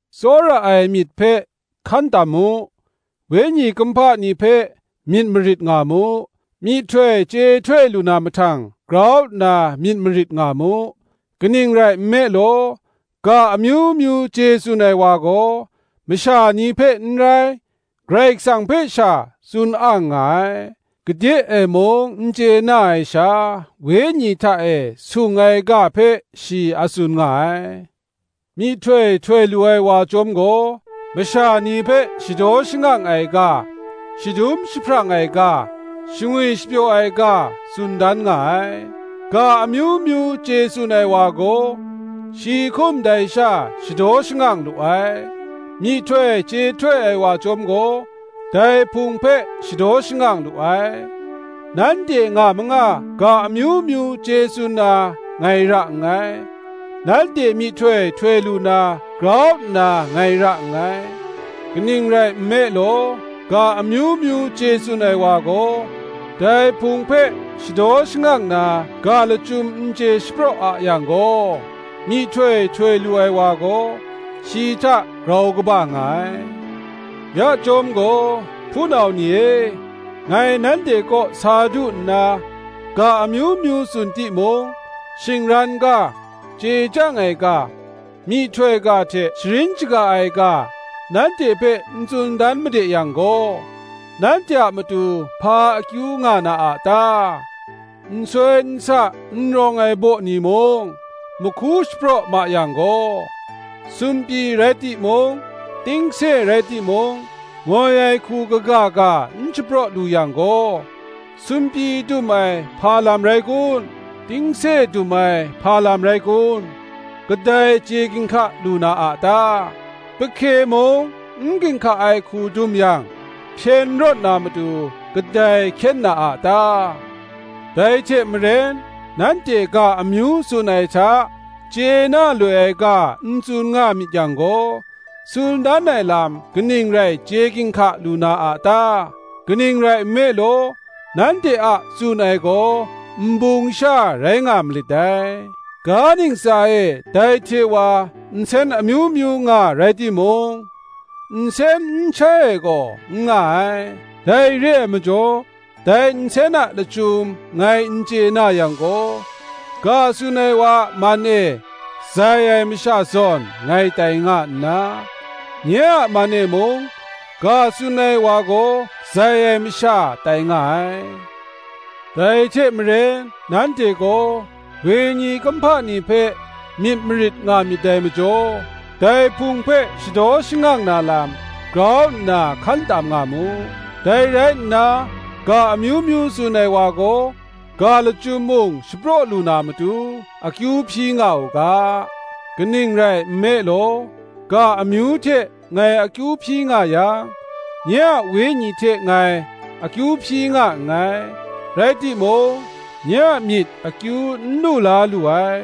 Tsawra ai myit hpe hkan tam mu; wenyi kumhpa ni hpe myit marit nga mu: myihtoi chye htoi lu na mahtang grau nna myit marit nga mu. Kaning rai nme law, ga amyu myu chye tsun ai wa gaw, masha ni hpe n rai, Karai Kasang hpe sha, tsun ang nga ai; gade ai mung n chye na ai sha, wenyi hta e sung ai ga hpe shi a tsun nga ai. Myihtoi htoi lu ai wa chyawm gaw masha ni hpe shadaw shangang ai ga, shadum jahprang ai ga, shangwi shapyaw ai ga tsun dan nga ai. Ga amyu myu chye tsun ai wa gaw, shi hkum dai sha shadaw shangang lu ai; myihtoi chye htoi ai wa chyawm gaw, dai Hpung hpe shadaw shangang lu ai. Nanhte nga manga ga amyu myu chye tsun na ngai ra nngai; nanhte myihtoi htoi lu na grau nna ngai ra nngai: kaning rai nme law, ga amyu myu chye tsun ai wa gaw, dai Hpung hpe shadaw shangang na ga lachyum n chye shapraw a yang gaw, myihtoi htoi lu ai wa gaw, shi hta grau kaba nga ai. Ya chyawm gaw, hpunau ni e, ngai nanhte kaw sa du nna, ga amyu myu tsun timung, shingran ga, chye chyang ai ga, myihtoi ga hte sharin shaga ai ga, nanhte hpe n tsun dan made yang gaw, nanhte a matu hpa akyu nga na a ta? Nsoi nsa n rawng ai baw ni mung mahku shapraw ma yang gaw, sumpyi rai timung, tingse rai timung, ngoi ai hku kaga ga n shapraw lu yang gaw, sumpyi dum ai hpa lam rai kun? tingse dum ai hpa lam rai kun? kadai chye ginhka lu na a ta? Pahke mung n ginhka ai hku dum yang, hpyen rawt na matu kadai hkyen na a ta? Dai hte maren nanhte ga amyu tsun ai hta, chye na loi ai ga n tsun nga myit yang gaw, tsun dan ai lam kaning rai chye ginhka lu na a ta? kaning rai nme law, nanhte a tsun ai gaw nbung sha rai nga malit dai. Ga ntsa e ndai hte wa nsen amyu myu nga rai timung, nsen n shai ai gaw n nga ai. Dai re ai majaw dai nsen a lachyum ngai n chye na yang gaw, ga tsun ai wa a man e zai ai masha zawn ngai tai nga nna, nye a man e mung, ga tsun ai wa gaw zai ai masha tai nga ai. Dai hte maren nanhte gaw wenyi kumhpa ni hpe myit marit nga myit dai majaw, dai Hpung hpe shadaw shangang na lam, grau nna hkan tam nga mu. Dai rai nna ga amyu myu tsun ai wa gaw, ga lachyum mung shapraw lu na matu akyu hpyi nga u ga. Kaning rai nme law, ga amyu hte ngai akyu hpyi nga yang, nye a wenyi hte ngai akyu hpyi nga nngai, rai timung nye a myit akyu n lu la lu ai.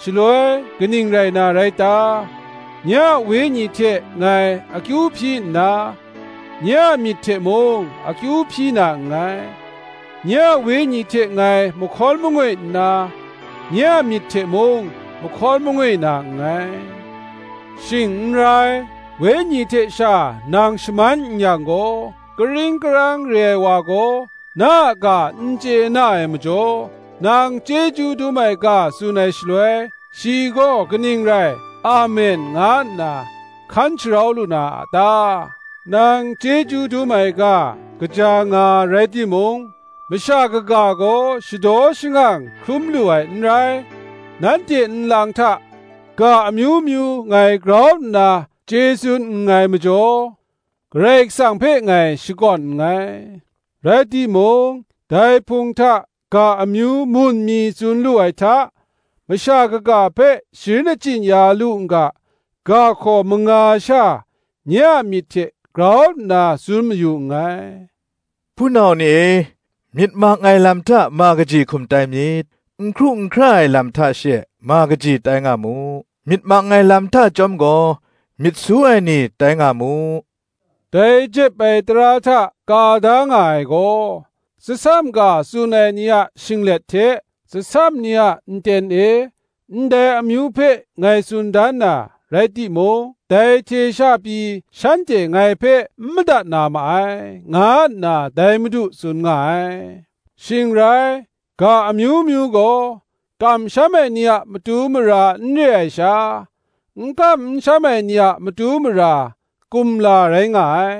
Shaloi kaning rai na rai ta? Nye a wenyi hte ngai akyu hpyi nna, nye a myit hte mung akyu hpyi na nngai; nye a wenyi hte ngai mahkawn mangoi nna, nye a myit hte mung mahkawn mangoi na nngai. Shing n rai, wenyi hte sha nang shaman n yang gaw, karing karang re ai wa gaw na a ga n chye na ai majaw, nang chyeju dum ai ga tsun ai shaloi, shi gaw kaning rai, Amen, nga nna hkan sharau lu na a ta? Nang chyeju dum ai ga kaja nga rai timung, masha kaga gaw shadaw shangang hkrum lu ai n rai. Nanhte nlang hta ga amyu myu ngai grau nna chye tsun nngai majaw, Karai Kasang hpe ngai shakawn nngai: rai timung, dai Hpung hta ga amyu mun mi tsun lu ai hta, Masha kaga hpe sharin achyin ya lu n ga, ga hkaw manga sha nye a myit hte grau nna tsun mayu nngai. Hpunau ni e, myit mang ai lam hta ma kaji hkum tai myit; n hkru n hkra ai lam hta she ma kaji tai nga mu; myit mang ai lam hta chyawm gaw, myit su ai ni tai nga mu. Dai jep ai tara hta ka da nga ai gaw, Tsasam ga tsun ai ni a shinglet hte tsasam ni a nten e, ndai amyu hpe ngai tsun dan na, rai timung dai hte sha pyi shanhte ngai hpe n madat na ma ai, nga nna dai Madu tsun nga ai. Shing rai, ga amyu myu gaw kamsham ai ni a matu mara n re ai sha, n kam n sham ai ni a matu mara, kumla rai nga ai;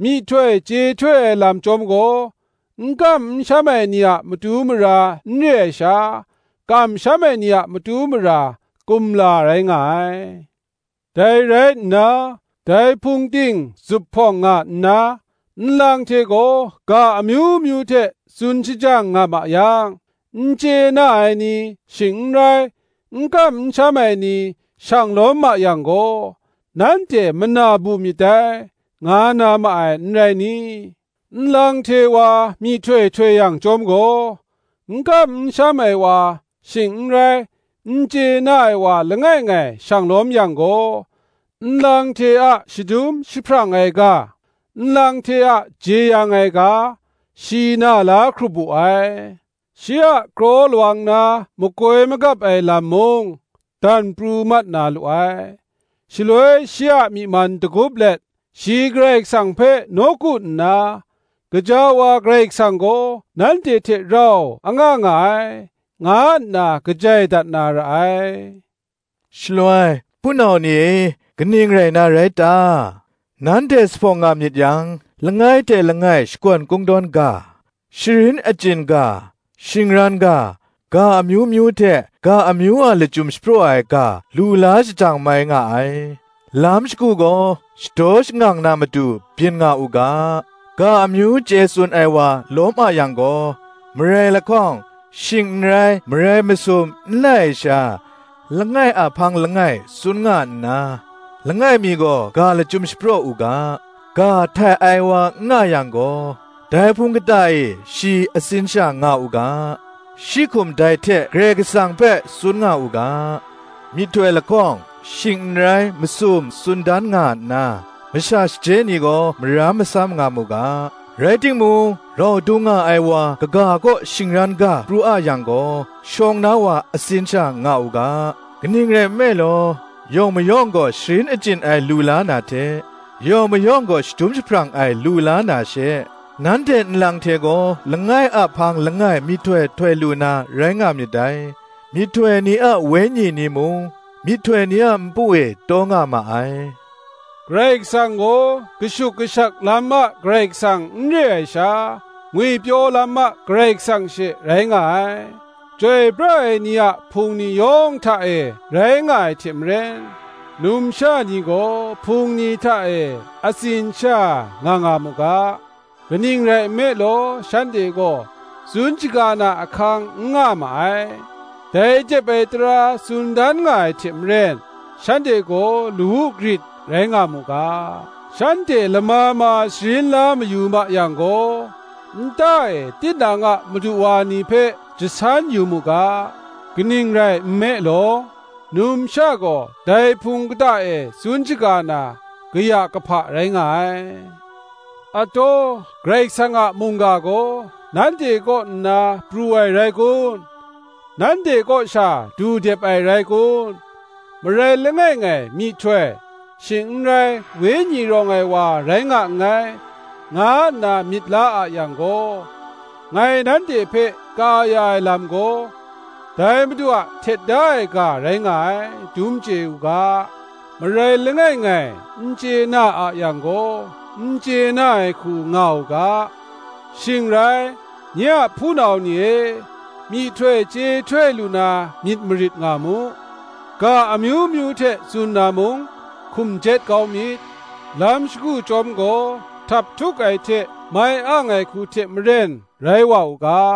myihtoi chye htoi ai lam chyawm gaw, n kam n sham ai ni a matu mara n re ai sha, kamsham ai ni a matu mara, kumla rai nga ai. Dai rai nna, dai Hpung ting zuphpawng nga nna, nlang hte gaw ga amyu myu hte tsun shajang nga ma yang, n chye na ai ni, shing n rai, n kam n sham ai ni, shang lawm ma yang gaw, nanhte mana bu myit dai, nga na ma ai, n rai ni? Nlang hte wa myihtoi htoi yang chyawm gaw, n kam n sham ai wa, shing n rai n chye na ai wa langai ngai shang lawm yang gaw, nlang hte a shadum jahprang ai ga, nlang hte a jeyang ai ga, shi na la hkrup wu ai; shi a kraw lawang na makoi magap ai lam mung dan pru mat na lu ai; shaloi shi a myi man dagup let, shi Karai Kasang hpe nawku nna, Gaja wa Karai Kasang gaw nanhte hte rau anga nga ai, nga nna kajai dat na ra ai. Shaloi, hpunau ni e, kaning rai na rai ta? Nanhte zuphpawng nga myit yang, langai hte langai shakawn kungdawn ga, sharin achyin ga, shingran ga, ga amyu myu hte ga amyu a lachyum shapraw ai ga lu la shajang mai nga ai: lam shagu gaw shadaw shangang na matu byin nga u ga. Ga amyu chye tsun ai wa lawm a yang gaw, marai lahkawng, shing n rai marai masum n lai ai sha, langai a hpang langai tsun nga nna, langai mi gaw ga lachyum shapraw u ga. Ga htai ai wa n nga yang gaw, dai Hpung kata e shi atsin sha nga u ga: shi hkum dai hte Karai Kasang hpe, tsun nga u ga. Myihtoi lahkawng, shing n rai masum tsun dan nga nna, masha shaje ni gaw maram masam nga mu ga. Rai timung, rau dung nga ai wa kaga kaw shingran ga pru a yang gaw, shawng na wa atsin sha nga u ga. Kaning rai nme law, yawng mayawng gaw sharin achyin ai lu la na hte, yawng mayawng gaw shadum jahprang ai lu la na she, nanhte nlang hte gaw langai a hpang langai myihtoi htoi lu na rai nga myit dai; myihtoi ni a wenyi ni mung, myihtoi ni a npu e taw na ma ai; Karai Kasang gaw kashuk kashak lam a Karai Kasang n re ai sha, ngwipyaw lam a Karai Kasang she rai nga ai. Chyoi pra ai ni a Hpung ni yawng hta e rai nga ai hte maren, numsha ni gaw Hpung ni hta e atsin sha nga nga mu ga: kaning rai nme law, shanhte gaw tsun shaga na ahkang n nga ma ai: dai jep ai tara tsun dan nga ai hte maren, shanhte gaw lawu grit rai nga mu ga. Shanhte lama ma sharin la mayu ma yang gaw, nta e tinang a madu wa ni hpe jasan yu mu ga: kaning rai nme law, numsha gaw dai Hpung kata e tsun shaga na kaya kahpa rai nga ai. Ataw, Karai Kasang a mungga gaw nanhte kaw nna pru ai rai kun? nanhte kaw sha du dep ai rai kun? Marai langai ngai myihtoi, shing n rai Wenyi rawng ai wa rai nga nngai, nga nna myit la a yang gaw, ngai nanhte hpe ka ya ai lam gaw, dai madu a htet da ai ga rai nga ai, dum chye u ga. Marai langai ngai n chye na a yang gaw, n chye na ai hku nga u ga. Shing rai, nye a hpunau ni e, myihtoi chye htoi lu na myit marit nga mu; ga amyu myu hte tsun na mung hkum jet kau myit. Lam shagu chyawm gaw, htaphtuk ai hte mai ang ai hku hte maren rai wa u ga.